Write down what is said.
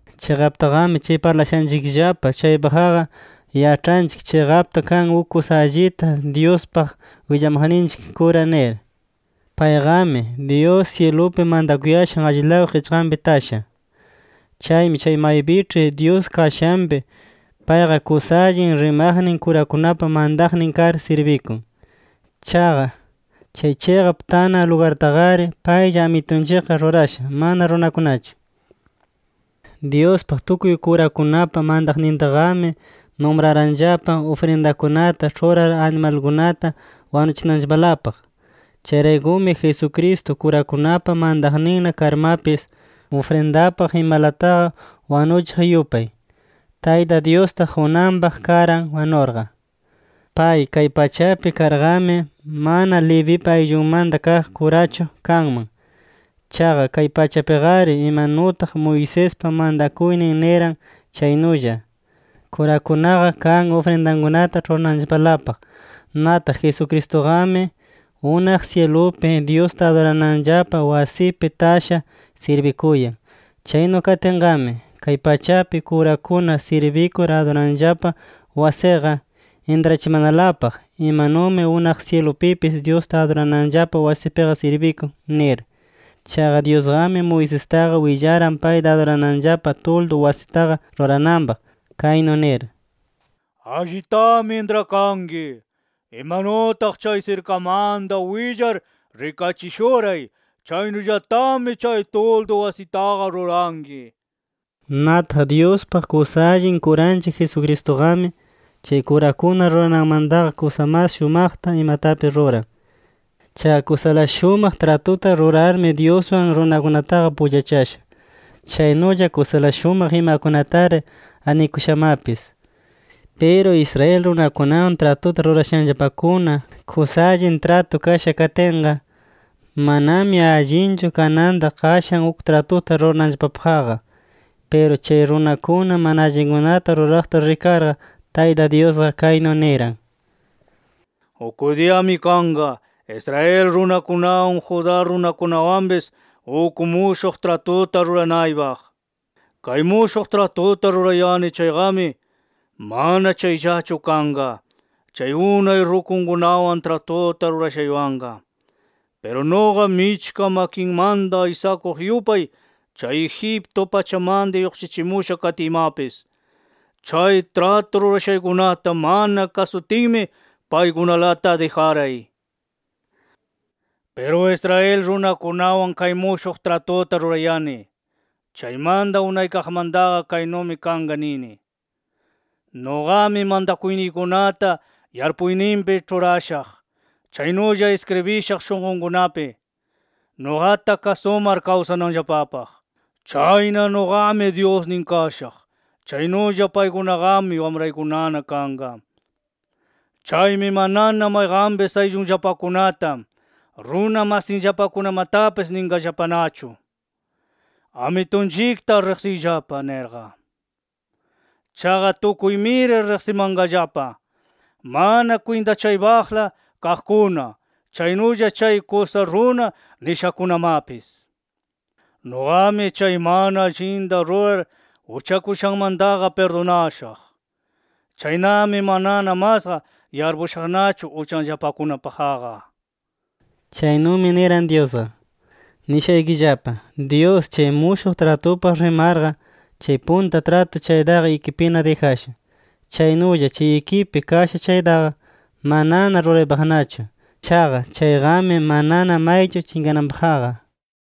Chiqaptaqami chay parlayashanchikllapa chaypaqqa, yaĉhanchik chiqapta kan uk kusa allita Dyuspaq willamaqninchik kura nir. Payqami, Dyus syilupi mantakuyashan allilaw qichqanpi tasha. Chaymi chay maypiĉhi Dyus kashanpi, payqa kusa allin rimaqnin kurakunapa mantaqnin kar sirbikun. Chaqa chay chiqap tanan lugartaqari paylla Amitunchikqa rurasha, mana runakunachu. Dyuspaq tukuy kurakunapa mantaqnintaqami, numranllapa ufrindakunata ĉhurar animalkunata wanuchinanllapalapaq. Chayraykumi Jesucristo kurakunapa mantaqninna karmapis, ufrindapaq imalataqa wanuchiq yupay, Tayta Dyusta qunanpaq karan wanurqa. Pay kay pachapi karqami, mana Levipa ayllunmanta kaq kurachu kanman. Chaqa kay pachapiqari imanutaq Moisespa mantakuynin niran chaynulla, kurakunaqa kan ufrindakunata ĉhurananllapalapaq. Nataq Jesucristuqami, unaq syilupi Dyusta adurananllapa wasipi tasha sirbikuyan. Chaynu katinqami, kay pachapi kurakuna sirbikur adurananllapa wasiqa, intrachimanalapaq imanumi unaq syilupipis Dyusta adurananllapa wasipiqa sirbikun, nir. Chaqa Dyusqami, Moisestaqa willaran payta adurananllapa tuldu wasitaqa rurananpaq kaynu nir: “Allitami intrakanki: Imanutaq chay sirkamanta willar rikachishuray, chaynullatami chay tuldu wasitaqa ruranki” nir. Nataq Dyuspaq kusa allin kuranchik Jesucristuqami, chay kurakuna rurananmantaqa kusa mas shumaqta imatapis ruran. Chaqa kusala shumaq tratuta rurarmi, Dyuswan runakunataqa pullachasha. Chaynulla kusala shumaq imakunatari arnikushamapis. Piru Israel runakunawan tratuta rurashanllapakuna, kusa allin tratu kasha katinqa, manami allinchu kananta qashan uk tratuta rurananllapapaqqa. Piru chay runakuna mana allinkunata ruraqta rikarqa, Tayta Dyusqa kaynu niran: “Uk diyami kanqa, Israel runakunawan, Judá runakunawanpis uk mushuq tratuta ruranaypaq. Kay mushuq tratuta rurayani chayqami, mana chayllachu kanqa, chay unay rukunkunawan tratuta rurashaywanqa. Piru nuqa michka makinmanta aysakuq yupay chay Egipto pachamanta lluqshichimusha katiymapis, chay tratu rurashaykunata mana kasutinmi paykunalata dijaray. Piru Israel runakunawan kay mushuq tratuta rurayani chaymanta unaykaqmantaqa, kaynumi kanqa nini: Nuqami mantakuyniykunata yarpuyninpi ĉhurashaq, chaynulla iskribishaq shunqunkunapi, nuqata kasumar kawsananllapapaq. Chayna nuqami Dyusnin kashaq. Chaynulla paykunaqami wamraykunana kanqa. Chaymi manana mayqanpis ayllunllapakunata, runa masinllapakunamatapis ninqallapanachu: ‘Amitunchikta riqsiyllapa’ nirqa. Chaqa tukuymiri riqsimanqallapa mana kwintachaypaqla kaqkuna, chaynulla chay kusa runa nishakunamapis. Nuqami chay mana allinta rurar uchakushanmantaqa pirdunashaq. Chaynami, manana masqa yarpushaqnachu uchanllapakunapaqqa”. Chaynumi niran Dyusqa. Nishaykillapa: Dyus chay mushuq tratupaq rimarqa, chay punta tratu chaytaqa ikipina dijasha. Chaynulla chay ikipi kasha chaytaqa, manana ruraypaqnachu. Chaqa chayqami manana maychu chinqananpaqqa.